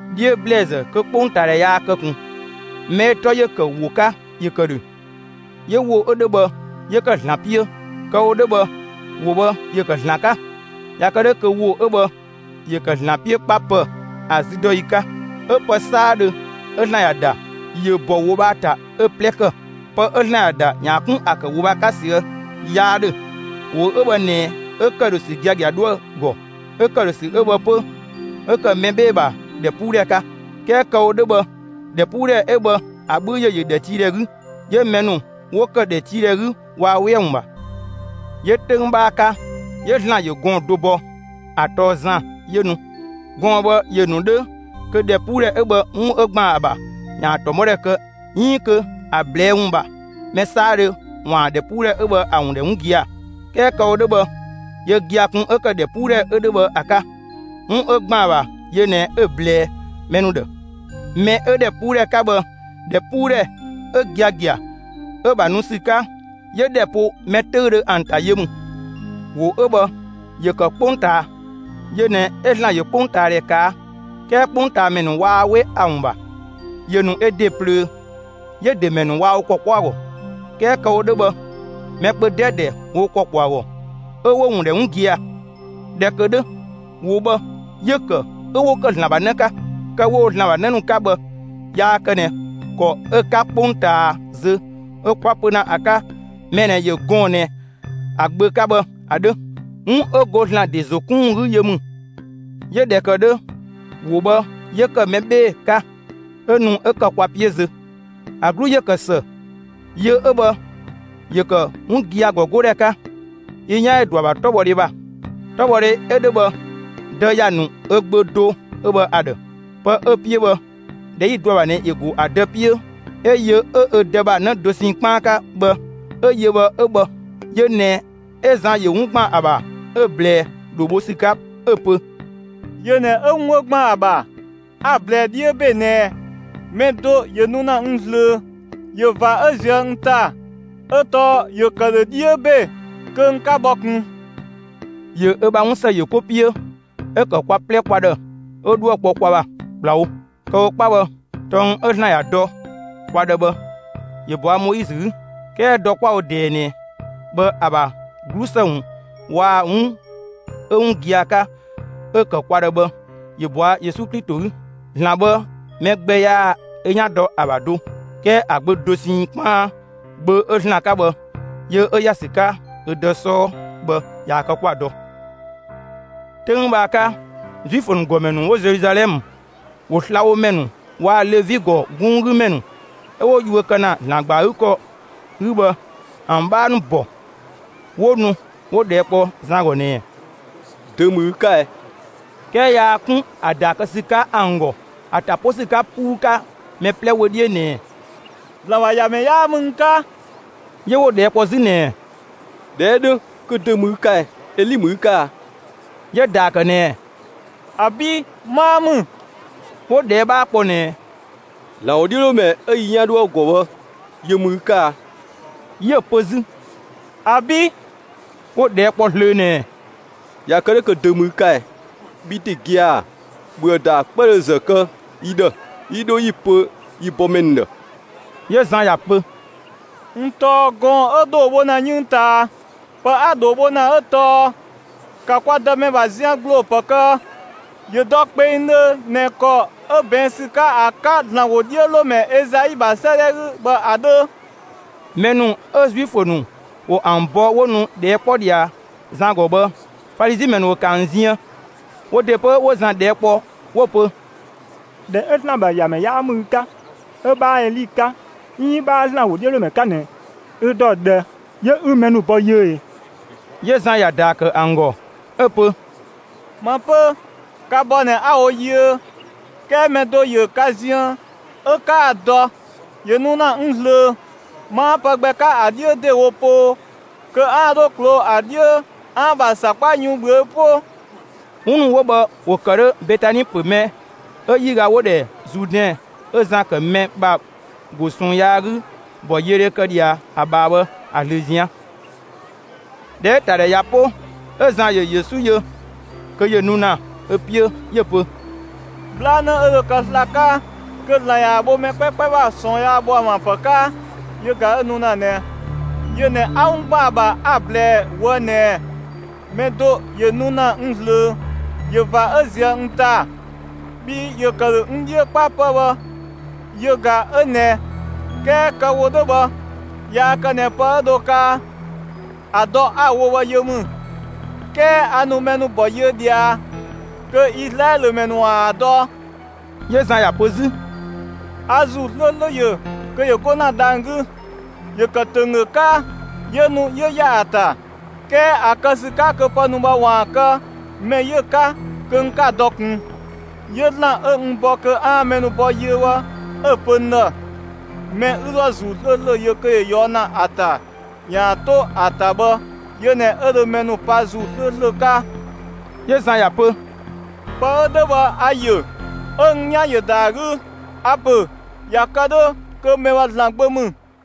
'Dhiö ‑blɛɛzë kö 'kpongtaadhɛ yaa kë ꞊kun, mɛ 'ö‑ 'tɔ ‑yö ‑kë ‑wo 'ka, ‑yö ‑kë ‑dhö. 'Yö ‑wo 'ö 'dhö bhë 'yö ‑kë ‑Zlan 'piö; kë‑ wo 'dhö bhë, ‑wo bhë ‑yö ‑kë ‑Zlan 'ka. ꞊Ya kë 'dhö kö ‑wo 'ö bhë ‑yö ‑kë ‑dhö ‑Zlan 'piö 'kpa 'pë‑, ‑a züdɔyi 'ka. 'Ö pë 'saadhö 'ö ‑Zlan ‑ya ‑da, ‑yö ‑bɔ ‑wo bhë ‑a ‑ta 'ö‑ 'plɛ ‑kë. Pë 'ö ‑Zlan ‑ya ‑da ‑yaan 'kun ‑a ‑kë ‑wo bhë ‑a 'ka ꞊süë' 'yaa 'dhö. ‑Wo 'ö bhë ꞊nɛ 'ö ‑këdhösü giagia 'dhoë‑ ‑gɔ; 'ö ‑këdhösü 'ö bhë 'pö, 'ö ‑kë mɛ 'bhee‑ ‑bha ‑dhɛpuudhɛ 'ka. 'Kɛɛ kë‑ wo 'dhö bhë ‑dhɛpuudhɛ 'ö bhë ‑a 'bhü ‑yö ‑yö ‑dhɛtiidhɛ 'gü, 'yö mɛ ‑nu 'wo këdhɛ ‑dhɛtiidhɛ 'gü, waa 'we ‑a ‑wun ‑bha. 'Yö 'töng 'bhaa 'ka, 'yö ‑Zlan ‑yö gɔɔn‑ do bɔ. ‑A tɔɔ Zan; 'yö nu. Gɔɔn‑ bhë ‑yö ‑nu 'dhö kö ‑dhɛpuudhɛ 'ö bhë, 'wun 'ö ‑gban ‑a ‑bha, ‑yaan ‑tɔmɔdhe kë 'iin kö ‑a ꞊blɛɛ' ‑wun ‑bha, mɛ 'saadhö ‑waan ‑dhɛpuudhɛ 'ö bhë ‑a ‑wun ‑dhɛ 'wun gia‑. 'Kɛɛ kë‑ wo 'dhö bhë, yö gia‑ kun 'ö ‑kë ‑dhɛpuudhɛ 'ö 'dhö bhë ‑a 'ka; 'wun 'ö ‑gban ‑a ‑bha, yö ꞊nɛ 'ö‑ ꞊blɛɛ mɛ ‑nu ‑dhë. Mɛ 'ö ‑dhɛpuudhɛ 'ka bhë, ‑dhɛpuudhɛ 'ö giagia, 'ö‑ ‑bha nu ‑sü 'ka, 'yö ‑dhɛ ‑po mɛ 'töüdhö ‑an ‑ta, yö ‑mü. ‑Wo 'ö bhë ‑yö ‑kë 'kpongtaa. Yö ꞊nɛ 'ö ‑Zlan ‑yö 'kpongtaadhɛ ꞊kaa'. 'Kɛɛ 'kpongtaamɛ ‑nu waa 'we ‑a ‑wun ‑bha. ‑Yö ‑nu ö ‑de ꞊plöö; 'yö‑ ‑de ‑mɛ ‑nu waa wo ‑kɔ 'kpɔ ‑a ‑gɔ. 'Kɛɛ kë‑ wo 'dhö bhë, mɛ kpö 'dɛdɛ ‑wo wo ‑kɔ ‑kpɔ ‑a ‑gɔ 'ö 'wo‑ ‑wun ‑dhɛ 'wun gia‑. ꞊Dhɛ ‑kë 'dhö, ‑wo bhë, 'yö‑ ‑kë 'ö 'wo ‑kë ‑Zlan ‑bha 'në 'ka. Kë 'wo‑ wo ‑Zlan ‑bha 'në ‑nu 'ka bhë yaa kë ꞊nɛ ‑kɔ 'ö‑ 'ka 'kpongtaa zö 'ö 'kwa‑ pö ‑na ‑a 'ka mɛ ꞊nɛ ‑yö gɔɔn‑ ꞊nɛ ‑a gbö 'ka bhë ‑a 'dhö. 'Wun 'ö go ‑Zlan ‑de ‑zo 'kun ‑wun 'gü yö ‑mü. 'Yö ꞊dhɛ ‑kë 'dhö, ‑wo bhë 'yö ‑kë mɛ 'bhee‑ 'ka, 'ö nu 'ö ‑kë kwa 'piö zö. ‑A 'glu ‑yö ‑kë ‑së. Yö 'ö bhë ‑yö ‑kë 'wun gia‑ ‑gɔgodhɛ 'ka. Yi 'yan ‑yö ‑dɔ ‑a ‑bha 'tɔbhɔdhe ‑bha. 'Tɔbhɔdhe 'ö 'dhö bhë, Dë ‑ya ‑nu ö Gbö do 'ö bhë ‑a ‑dhë. Pë 'ö‑ 'piö bhë, ꞊dhɛ 'yi‑ dɔ ‑a ‑bha ꞊nɛ ‑yö ‑go ‑a Dë 'piö, 'ö yö 'ö ö Dë ‑bha 'në dosɛn 'kpaan 'ka bhë 'ö‑ yö bhë 'ö bhë. Yö ꞊nɛ 'ö Zan ‑yö 'wun ‑gban ‑a ‑bha 'ö‑ ꞊blɛɛ ‑dhoo bho ‑sü 'ka, 'ö‑ pö: «Yö ꞊nɛ 'ö 'wun 'ö ‑gban ‑a ‑bha, a‑ ‑blɛɛ 'dhiö ‑be ꞊nɛɛ: Mɛ do ‑yö nu ‑na n ꞊zlöö; ꞊yö ꞊va 'ö ‑ziö n ‑ta. 'Ö tɔɔ ‑yö ‑kë ‑dhö 'dhiö ‑be kö n 'ka bhɔ ꞊kun.» ‑Yö ö ‑bha 'wunsë ‑yö 'ko 'piö 'ö ‑kë kwa 'plɛ kwa ‑dhë 'ö 'dhuë‑ kpɔ kwa ‑bha ‑kplawo. Kë‑ wo 'kpa bhë, tɔng 'ö ‑Zlan ‑ya dɔ kwa ‑dhë bhë, ‑yö ꞊bɔa' Moizö 'gü. 'Kɛɛ dɔ 'kwa‑ wo ꞊dɛɛ ꞊nɛ bhë, ‑a ‑bha 'glusë ‑wun waa‑ 'wun 'ö 'wun gia‑ 'ka 'ö ‑kë kwa ‑dhë bhë, ‑yö bɔa Yesu Klito 'gü. ‑Zlan bhë mɛ gbɛ yaa ö 'yan dɔ ‑a ‑bha do. 'Kɛɛ ‑a Gbö dosɛn 'kpaan, Gbö 'ö ‑Zlan 'ka bhë, yö 'ö ‑ya ‑sü 'ka ö Dë 'sɔɔ bhë, ꞊yaa‑ kë 'kwa‑ dɔ. 'Töng bhë ‑a 'ka, Zuifö ‑nu ‑gɔmɛ ‑nu 'wo Zeluzalɛmë, ‑wo slabhomɛ ‑nu waa‑ Levi ‑gɔ 'gunng 'gü ‑mɛ ‑nu 'ö 'wo yuö kë ‑na ‑Zlan ‑gba ‑a 'gü ‑kɔ 'gü bhë ‑an 'bhaa ‑nu ‑bɔ, 'wo nu 'wo ꞊dhɛɛ' kpɔ Zan ‑gɔ ꞊nɛɛ: «Dö ‑mü ü 'ka ɛ?» 'Kɛɛ yaa 'kun ‑a ‑daa kë ‑sü 'ka ‑an ‑gɔ, ‑a ‑ta pö ‑sü 'ka 'puu 'ka mɛ 'plɛ wö 'dhiö ꞊nɛɛ: «‑Zlan ‑bha ‑Yamɛ 'yaa ‑mü n 'ka.» 'Yö 'wo‑ ꞊dhɛɛ' kpɔ 'zü ꞊nɛɛ: «꞊Dhɛ 'ö 'dhö, kö dö ‑mü ü 'ka ɛ? Eli ‑mü ü 'ka a?» 'Yö‑ ‑daa ‑kë ꞊nɛɛ: «‑Abi'! 'Maa ‑mü.» 'Wo ꞊dhɛɛ' 'bhaa kpɔ ꞊nɛɛ: «‑Zlan ‑wodhiölomɛ 'ö yi 'yan 'dhoë‑ ‑gɔ bhë yö ‑mü ü 'ka a?» 'Yö‑ pö 'zü: «‑Abi'!» 'Wo‑ ꞊dhɛɛ' kpɔ zlöö ꞊nɛɛ: «꞊Ya kë 'dhö kö dö ‑mü ü 'ka ɛ? Bhi ‑de gia‑, ‑bhöë ‑daa 'kpëdhö ‑zë kë yi ‑dhë 'yi 'dho 'yi‑ pö yi bɔmɛ ‑nu ‑dhë.» 'Yö Zan ‑ya pö: «N tɔɔ gɔɔn‑ 'ö ‑dhoo bho ‑na 'yënng ꞊taa. Pë 'a‑ ‑dhoo bho ‑na 'ö tɔɔ: ‑Ka kwa Dëmɛ ‑bha zian ‑gbloo ‑pë kë; ‑yö dɔ kpengdhö ꞊nɛ ‑kɔ 'ö ꞊bɛɛn' ‑sü 'ka ‑a 'ka ‑Zlan ‑wodhiölomɛ Ezai ‑bha 'sëëdhɛ 'gü bhë ‑a 'dhö.» Mɛ ‑nu 'ö Zuifö ‑nu ‑wo ‑an bɔ 'wo nu ꞊dhɛɛ' 'kpɔ ꞊dhia Zan ‑gɔ bhë, Falizi ‑mɛ ‑nu ‑wo ‑kë ‑an ziën. Wo ‑de 'pö, ‑wo Zan ꞊dhɛɛ' ‑kpɔ, 'wo‑ pö: «꞊Dhɛ 'ö ‑Zlan ‑bha ‑Yamɛ 'yaa ‑mü ü 'ka, 'ö 'bhaa Eli 'ka, 'iin 'bhaa ‑Zlan ‑wodhiölomɛ 'ka ꞊nɛ, ü ‑dɔ ꞊dhë 'yö ü mɛ ‑nu bɔ yiö ꞊ee?» 'Yö Zan ‑ya ‑daa ‑kë ‑an ‑gɔ, 'ö‑ pö: «Ma 'pö, ka bɔ ꞊nɛ 'a‑ wo yiö; 'kɛɛ mɛ do ‑yö ka ziën 'ö 'kaa‑ dɔ. ‑Yö nu ‑na n ꞊zlöö. 'Maa pë gbɛ 'ka ‑a 'dhiö ‑dewo poo kö 'aan‑ 'dho ꞊kloo'‑ ‑a 'dhiö 'aan‑ ‑bha ‑sakpa yun ꞊bhüö' 'po.» 'Wun ‑nu 'wo bhë, ‑wo ‑kë 'dhö Betani ‑pö mɛ 'ö 'yiga 'wo‑ ‑dhɛ Zuudɛn 'ö Zan ‑kë mɛ ‑bha ‑go ꞊sɔɔn yaa 'gü ‑bɔyiödhe kë ꞊dhia ‑a ꞊bhaa bhë ‑a ꞊zlöö ꞊zian'. ꞊Dhɛ 'ö‑ ‑ta ‑dhɛ ꞊ya 'po, 'ö Zan ‑yö Yesu yö kö ‑yö nu ‑na ö 'piö, 'yö‑ pö: «'Bhlanë 'ö dho kë sla‑ 'ka kö ‑Zlan ‑yaan bho mɛ 'kpɛkpɛ ‑bha ꞊sɔɔn yaa ‑bho ‑an ‑bha ‑pë 'ka yö ꞊ga 'ö nu ‑na ꞊nɛ! Yö ꞊nɛ 'a 'wun ‑gban ‑a ‑bha 'a‑ ꞊blɛɛ ꞊woë' ꞊nɛɛ: Mɛ do ‑yö nu ‑na n ꞊zlöö; ꞊yö ꞊va 'ö ꞊zië' n ‑ta, bhii ‑yö ‑kë ‑dhö n 'dhiö 'kpa 'pë‑ bhë, yö ꞊ga 'ö ꞊nɛ. 'Kɛɛ kë‑ wo 'dhö bhë yaa kë ꞊nɛ pë 'ö dho kaa, ‑a dɔ 'a‑ wo bhë yö ‑mü, 'kɛɛ a ‑nu mɛ ‑nu ‑bɔ yiö ꞊dhia kö Izlaɛlö ‑mɛ ‑nu ‑waan ‑a dɔ.» 'Yö Zan ‑ya pö 'zü: «A ‑Zuu 'slööslö ‑yö kö ‑yö 'go ‑na dhang‑ 'gü. ‑Yö ‑kë ‑tönggö 'ka, 'yö nu 'yö ‑ya ‑a ‑ta. 'Kɛɛ ‑a kë ‑sü 'ka kö pë ‑nu bhë ‑waan kë, mɛ 'yö‑ 'ka, kö n 'ka‑ dɔ ꞊kun. 'Yö ‑Zlan 'ö n bɔ kö 'aan‑ mɛ ‑nu bɔ yiö bhë, 'ö‑ pö n ‑dhë: ‹Mɛ 'ü 'dhoë‑ ‑Zuu 'slööslö yö kö ‑yö ꞊yɔɔ' ‑na ‑a ‑ta ‑yaan 'to ‑a ‑ta bhë, yö ꞊nɛ 'ö dho mɛ ‑nu pa ‑Zuu 'slööslö 'ka.›» 'Yö Zan ‑ya pö: «Pë 'ö 'dhö bhë a‑ ‑yö ('ö n 'yan ‑yö ‑da ‑a 'gü); a‑ ‑pö ꞊ya kë 'dhö kö mɛ bhë ‑Zlan Gbö ‑mü.»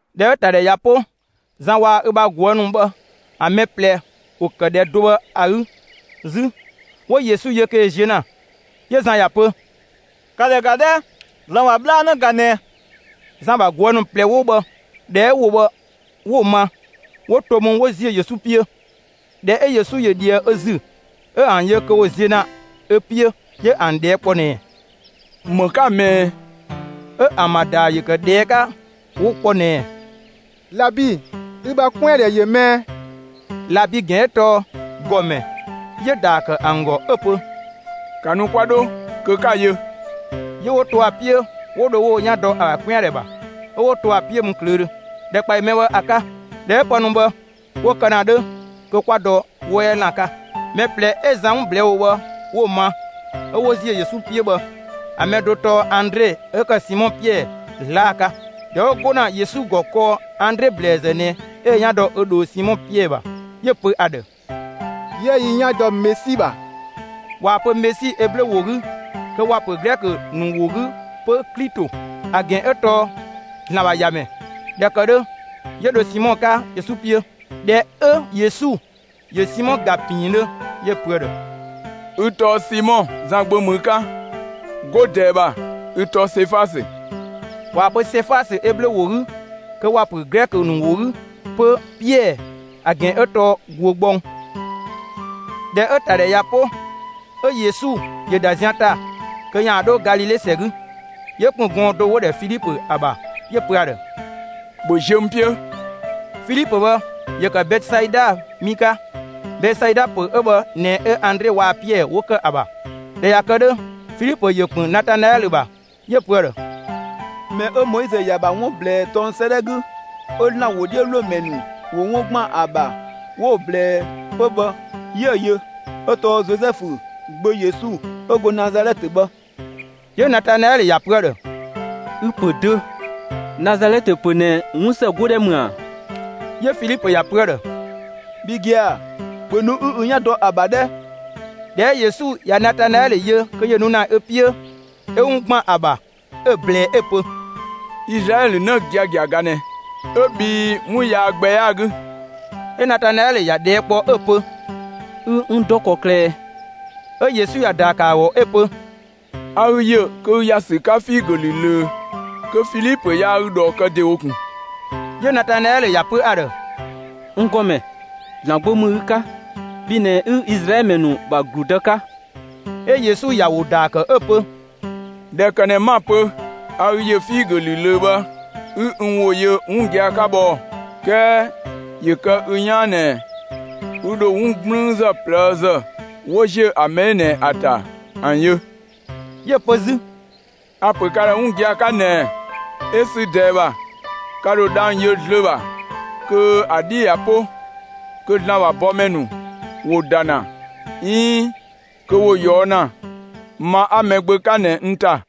꞊Dhɛ 'ö‑ ‑ta ‑dhɛ ꞊ya 'po; Zan waa‑ ö ‑bha ꞊guë' ‑nu bhë ‑an mɛ ꞊plɛ ‑wo ‑kë ‑dhɛ do bhë ‑a 'gü 'zü; 'wo Yesu yö kö ‑yö ziö ‑na; 'yö Zan ‑ya pö: «‑Ka ‑dhɛ ‑ga 'dhɛ! ‑Zlan ‑bha 'bhlanë ꞊ga ꞊nɛ!» Zan ‑bha ꞊guë' ‑nu ꞊plɛ 'wo bhë, ꞊dhɛ 'ö ‑wo bhë 'wo‑ ma, 'wo to mü 'wo ‑ziö Yesu 'piö. ꞊Dhɛ 'ö Yesu ‑yö ꞊dhië ö ‑zü, 'ö ‑an yö kö ‑wo ziö ‑na ö 'piö, 'yö ‑an ꞊dhɛɛ' kpɔ ꞊nɛɛ: «‑Më 'ka‑ ꞊mɛɛ?» 'Ö ‑an ‑bha ‑daa ‑yö ‑kë ꞊dhɛɛ' 'ka 'wo‑ kpɔ ꞊nɛɛ: «Labi, ü ‑bha 'kwɛandhɛ ‑yö mɛɛ?» (Labi ‑gɛn 'ö tɔɔ «‑Gɔmɛ».) 'Yö‑ ‑daa ‑kë ‑an ‑gɔ 'ö‑ pö: «‑Ka nu 'kwa 'dho, kö 'ka‑ yö!» 'Yö 'wo to ‑a 'piö, 'wo dho 'wo wo 'yan dɔ ‑a ‑bha 'kwɛandhɛ ‑bha, 'ö 'wo to ‑a 'piö mü ꞊klöödhö ‑dhɛkpaɔyi mɛ bhë ‑a 'ka. (꞊Dhɛ 'ö pë ‑nu bhë 'wo kë ‑na 'dhö kö 'kwa dɔ 'wɔ 'yɛ ‑lan 'ka.) Mɛ ꞊plɛ 'ö Zan 'wun ꞊blɛɛ' ‑wo bhë 'wo‑ ma 'ö 'wo ‑ziö Yesu 'piö bhë, ‑a mɛ do tɔɔ Andre 'ö ‑kë Simɔ Piɛɛ 'zlaa‑ 'ka. ꞊Dhɛ 'wo 'go ‑na Yesu ‑gɔ kɔɔ, Andre ‑blɛɛzë ꞊nɛ 'ö ö 'yan dɔ ö ꞊dhoo Simɔ Piɛɛ ‑bha; 'yö‑ pö ‑a ‑dhë: «'Yië yi 'yan dɔ Mesi ‑bha!» (꞊Waa‑ pö Mesi Eblö ‑wo 'gü, kö ‑wa ‑pö Glɛkö ‑nu ‑wo 'gü 'pö «Klito», ‑a ‑gɛn 'ö tɔɔ «‑Zlan ‑bha ‑Yamɛ».) ꞊Dhɛ ‑kë 'dhö, ‑yö ‑dho Simɔ 'ka Yesu 'piö. ꞊Dhɛ 'ö Yesu ‑yö Simɔ ‑ga ‑piindhö, 'yö‑ pö ‑a ‑dhë: «Ü tɔɔ Simɔ; Zan gbö ‑mü ü 'ka. 'Go ꞊dɛɛ ‑bha, ü tɔɔ Sefasö.» (꞊Waa‑ pö Sefasö Eblö ‑wo 'gü kö ‑wa ‑pö Glɛkö ‑nu ‑wo 'gü 'pö «Piɛɛ», ‑a ‑gɛn tɔɔ «‑guö gbɔng».) ꞊Dhɛ 'ö‑ ‑ta ‑dhɛ ꞊ya 'po, 'ö Yesu ‑yö ‑da zian ‑ta kö ‑yaan 'dho Galile ‑sɛ 'gü; 'yö ‑kpën gɔɔn‑ do 'wo‑ ‑dhɛ Filipö ‑a ‑bha; 'yö‑ pö ‑a ‑dhë: «‑Bhö ziö n 'piö!» Filipö bhë, ‑yö ‑kë Betesaida mi 'ka. Betesaida ‑pö 'ö bhë ꞊nɛ 'ö Andre waa‑ Piɛɛ 'wo ‑kë ‑a ‑bha. ꞊Dhɛ ꞊ya kë 'dhö, Filipö ‑yö ‑kpën Natanaɛlö ‑bha; 'yö‑ pö ‑a ‑dhë: «Mɛ 'ö Moizö ‑ya ‑bha 'wun ꞊blɛɛ tɔng 'sëëdhɛ 'gü, 'ö ‑Zlan ‑wodhiölomɛ ‑nu ‑wo 'wun ‑gban ‑a ‑bha 'wo‑ ꞊blɛɛ 'pö bhë, 'yië‑ yö; 'ö tɔɔ Zozɛfu gbö Yesu 'ö go Nazalɛtë bhë.» 'Yö Natanaɛlö ‑ya pö ‑a ‑dhë: «Ü‑ ‑pö dö! Nazalɛtë ‑pö ꞊nɛ, 'wunsë 'godhɛ ‑mü ꞊a?» 'Yö Filipö ‑ya pö ‑a ‑dhë: «Bhi gia‑, ‑bhö nu 'ü ü 'yan dɔ ‑a ‑bha 'dhɛ!» ꞊Dhɛ 'ö Yesu ꞊ya Natanaɛlö yö kö ‑yö nu ‑na ö 'piö, 'ö 'wun ‑gban ‑a ‑bha 'ö‑ ꞊blɛɛ 'ö‑ pö: «Izlaɛlö 'në giagia ꞊ga ꞊nɛ, 'ö bhii 'wun yaa gbɛ 'yaa‑ 'gü!» 'Ö Natanaɛlö ‑ya ꞊dhɛɛ' kpɔ 'ö‑ pö: «Ü n ‑dɔ ‑kɔklë ꞊ɛ?» 'Ö Yesu ‑ya ‑daa ‑kë ‑a ‑gɔ 'ö‑ pö: «A ü ‑yö kö ü ‑ya ‑sü 'ka figö ‑lü ꞊löö kö Filipö yaa ü ꞊dhɔɔ kë ‑de wo ꞊kun.» 'Yö Natanaɛlö ‑ya pö ‑a ‑dhë: «N ‑Gɔmɛ, ‑Zlan Gbö ‑mü ü 'ka; bhi ꞊nɛ 'ü Izlaɛlö ‑mɛ ‑nu ‑bha ‑gludë 'ka!» 'Ö Yesu ‑ya ‑wo ‑daa ‑kë 'ö‑ pö: «꞊Dhɛ ‑kë ꞊nɛ 'ma‑ pö a ü ‑yö figö ‑lü ꞊löö bhë, 'ü n ‑wo yö 'wun gia‑ 'ka bhë ɔɔ‑; 'kɛɛ ‑yö kë ü 'yaan ꞊nɛ ü ‑dho 'wun 'gblüünzë ꞊plëëzë 'wo ‑ziö ‑a mɛ 'ö ꞊nɛ ‑a ‑ta ‑an yö.» 'Yö‑ pö 'zü: «A‑ ‑pö ka ‑dhë 'wun gia‑ 'ka ꞊nɛɛ: 'Ö sü ꞊dɛɛ ‑bha, ka ‑dho dhang‑ yö zlöö ‑bha kö ‑a 'dhi ꞊ya 'po kö ‑Zlan ‑bha bɔmɛ ‑nu ‑wo ‑da ‑na 'iin kö ‑wo ꞊yɔɔ' ‑na ma 'a Mɛgbö 'ka ꞊nɛ n ‑ta.»